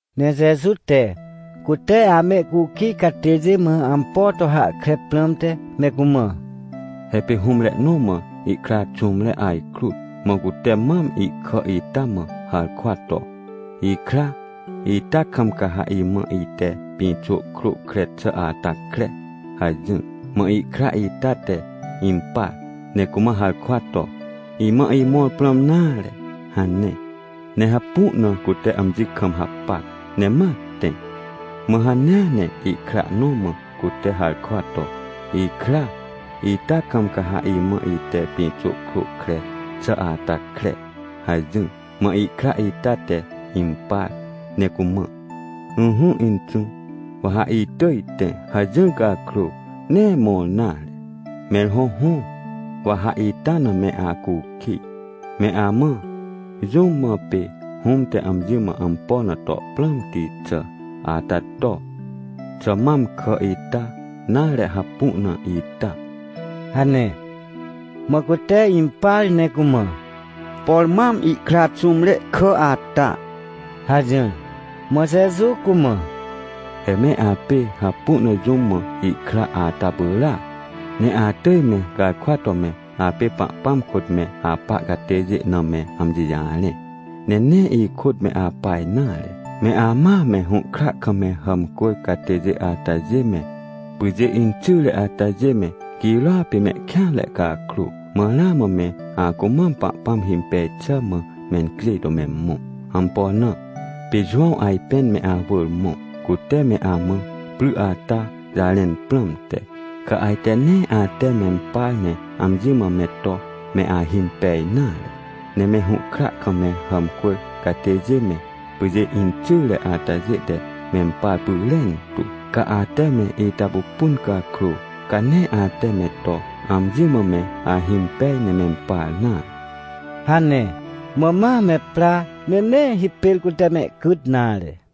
Ne Jeju te cute amehcukij catêjê mã ampo to hahkre prãmte me cumã: — He pê hũmre nõ mã ihkra xũmre ajkrut. Mã cute mam ihkà ita mã harkwa to: “Ikra, ita kam ca ha imã ite pĩxô krô kre xà ata kre” hajỹr. — Mã ihkra ita te impar ne cumã harkwa to: “Imã imõr prãm nare” hane. Ne hapu na cute amji kam hapac, ne ma tẽ. — Mã hanea ne ihkra nõ mã cute harkwa to: “Ikra, ita kam ca ha imã ite pĩxô krô kre xà ata kre” hajỹr. Mã ihkra ita te impar ne cumã: “Ỹhỹ inxũ, wa ha itỳj tẽ” hajỹr cakrô, nee mõr nare. — Mẽr hõhõ, wa ha ita na me acukij. Me amã, jũm mã pê hũm te amji mã ampo na to prãmti xà ata to? Xà mam kà ita, nare, hapu na ita? — hane. Mã cute impar ne cumã: — Por mam ihkra xũmre kà ata — hajỹr. Mã Jeju cumã: — He me apê hapu na jũm mã ihkra ata pyràac. Ne atỳj me garkwa to me apê Pahpãm kôt me apa catêjê na me amji jarẽ, ne nee ihkôt me apa nare. Me amãa me hũhkra kam me hàmcwỳr catêjê atajê me, pyjê inxyre atajê me girôa pê mehkêanre cakrô, mãramã me acumam Pahpãm himpej xà mã mencjêj to me mõ. Ampo na? Pê Jowãw ajpên me awỳr mõ, cute me amã pry ata jarẽn prãmte, ca ajte nee ate mempar ne amji mã me to me ahimpej nare. Ne me hũhkra kam me hàmcwỳr catêjê me, pyjê inxyre atajê te mempar pyrentu. Ca ate me ita pupun cakrô, ca nee ate me to amji mã me ahimpej ne mempar nare — hane. Mã ma me pra, ne nee hipêr cute mehcyt nare.